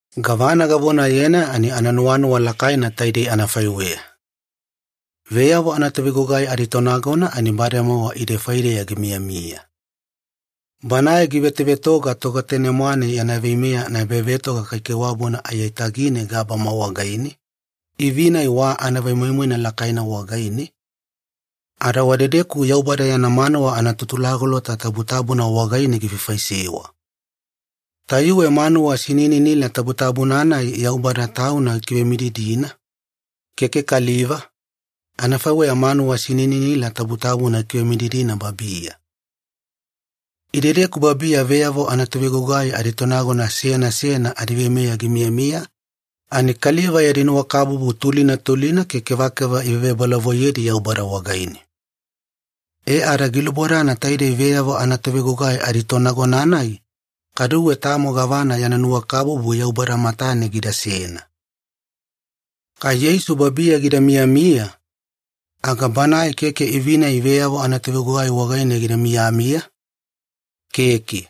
Gavana gavonayena ani ananuwanuwa lakaina taidei anafaiweya. Veyavo anatovegugai aditonagona ani bademowa ide faideya gimiyamiya. Banae givetovetoga Togetane-mwane yana veimeya anaebavetoga kaikaiwabuna aiyatagine gabama wagaine, ivi-nai wa anavemoimoina lakaina wagaine, ada wadedeku Yaubada yana manuwa anaTutulagolota Tabutabuna wagaine gifaifaisewa. Tayuwe manuwa sinininila tabutabuna-nai Yaubada Tauna gikivemididina, keke kaliva, anafaiweya manuwa sinininila tabutabuna ikivemididina babiya. Idedeku babiya veyavo anatovegugai aditonagona seyana seyana adiveimeya gimiyamiya, ani kaliva yadi nuwakabubu tulina tulina ke kevakeva ivevebolavoiyedi Yaubada wagaine. E ada gilubodana taidei veyavo anatovegugai aditonagona-nai kaduwe tamo gavana yana nuwakabubu Yaubada matane gidasena. Kai Yeisu babiya gida miyamiya, aga Banae keke ivi-nai veyavo anavetogugai wagaine gida miyamiya, keke.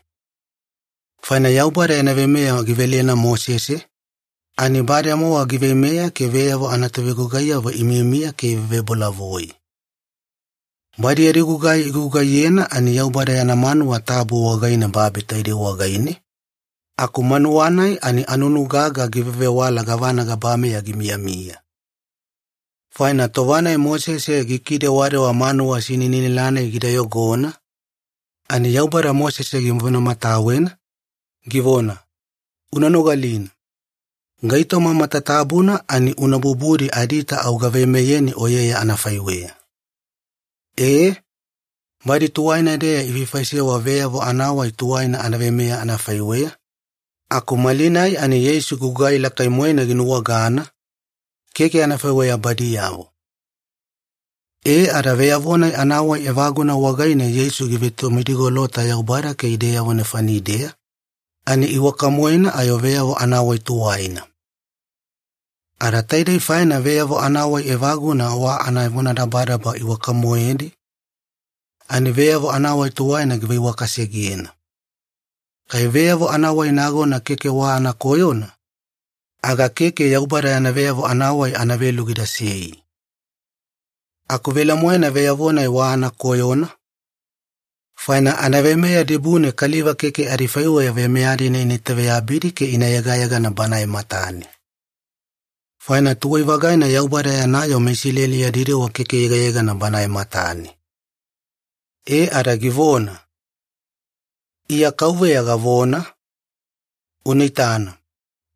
Faina Yaubada yana veimeya givelena Mosese, ani bademowa giveimeya ke veyavo anatovegugaiyavo imiyamiya ke ivevebolavoi. Badi yadi gugai igugaiyena ani Yaubada yana manuwa tabu wagaine babi taidei wagaine, aku manuwa-nai ani anunu gaga givevewala gavana gabameya gimiyamiya. Faina tova-nai Mosese gikidewadewa manuwa sinininila-nai gida iyogona, ani Yaubada Mosese givonamatawena, givona, “Una nogalina. Gaitoma matatabuna ani una bubudi adiita au gaveimeyeni oyeya anafaiweya.” E, badi tuwaina-deya ifaifaisewa veyavo anawai tuwaina anaveimeya anafaiweya, aku malinai ani Yeisu gugai lakai-moena ginuwagana, keke anafaiweya badiyavo. E ada veyavo-nai anawai evaguna wagaine Yeisu givetomidigolota Yaubada ke ideyavo nefanideya, ani iwaka-moena ayo veyavo anawai tuwaina. Ada taidei faina veyavo anawai evaguna wa anavonadabadaba iwaka-moedi, ani veyavo anawai tuwaina giveiwakasegena. Kai veyavo anawai nagona keke wa anakoyona, aga keke Yaubada yana veyavo anawai anavelu gidasei. Aku velemoena veyavo-nai wa anakoyona, faina anaveimeya dibune kaliva keke adifaiweya veimeya-dina ina itaveyabidi ke ina yegayegana Banae matane. Faina tuwai-vagaina Yaubada yana yoo meIsileli yadi dewa keke yegayegana Bana matane. E ada givona, “Iya KAUVEYA gavona, Una itana,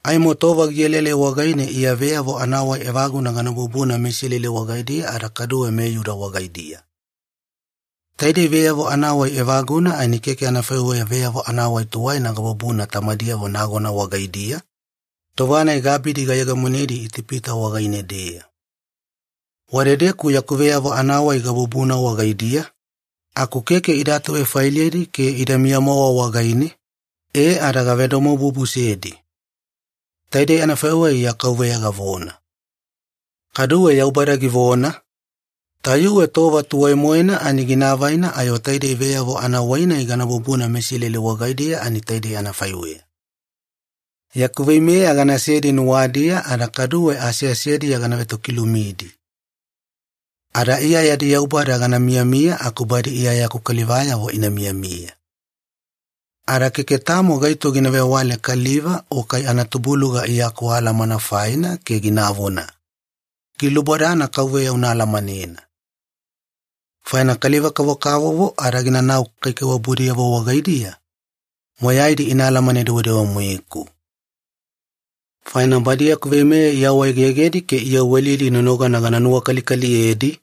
aimo tova gielaelai wagaine Iya veyavo anawai evaguna gana bubuna meIsileli wagaidiya ada kaduwe meIyuda wagaidiya. Taidei veyavo anawai evaguna ani keke anafaiweya veyavo anawai tuwaina gabubuna tamadiyavo nagona wagaidiya, tova-nai gaabidi gayegemonedi Itipita wagaine-deya. Wadedeku yaku veyavo anawai gabubuna wagaidiya, aku keke ida atuvefailedi ke idamiya-mowa wagaine, e ada gavedomobubusedi. Taidei anafaiweya Iya KAUVEYA gavona.” Kaduwe Yaubada givona, “Tayuwe tova tuwai-moena ani gina avaina ayo taidei veyavo anawai-nai gana bubuna meIsileli wagaidiya ani taidei anafaiweya. Yaku veimeya ganasedi nuwadiya ada kaduwe aseasediya gana vetokilumidi. Ada Iya yadi Yaubada gana miyamiya aku badi Iya yaku kalivayavo ina miyamiya. Ada keke tamo gaito gina vewale kaliva o kai anatubuluga Iya akualamana faina ke ginavona, ‘Gilubodana KAUVEYA una alamanena.’ Faina kaliva-kavokavovo ada ginanau kaikaiwabudiyavo wagaidiya, moyaidi ina alamane-dewedewe-moeku. Faina badi yaku veimeya iawaegegedi ke iyawelidi nonogana gana nuwakalikaliyedi,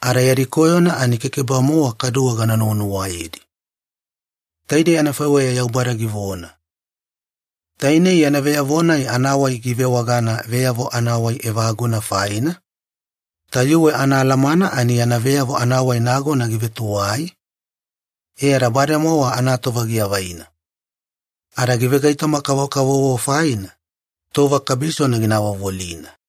ada yadi koyona ani keke-bamowa kaduwe gana nuwanuwayedi.” Taidei anafaiweya Yaubada givona. Tainei yana veyavo-nai anawai givewagana ‘veyavo anawai evaguna’ faina, tayuwe anaalamana ani yana veyavo anawai nagona givetuwai, e ada bademowa anatova giavaina. Ada givegaitoma-kavokavovo faina, tova kabisona gina avovolina.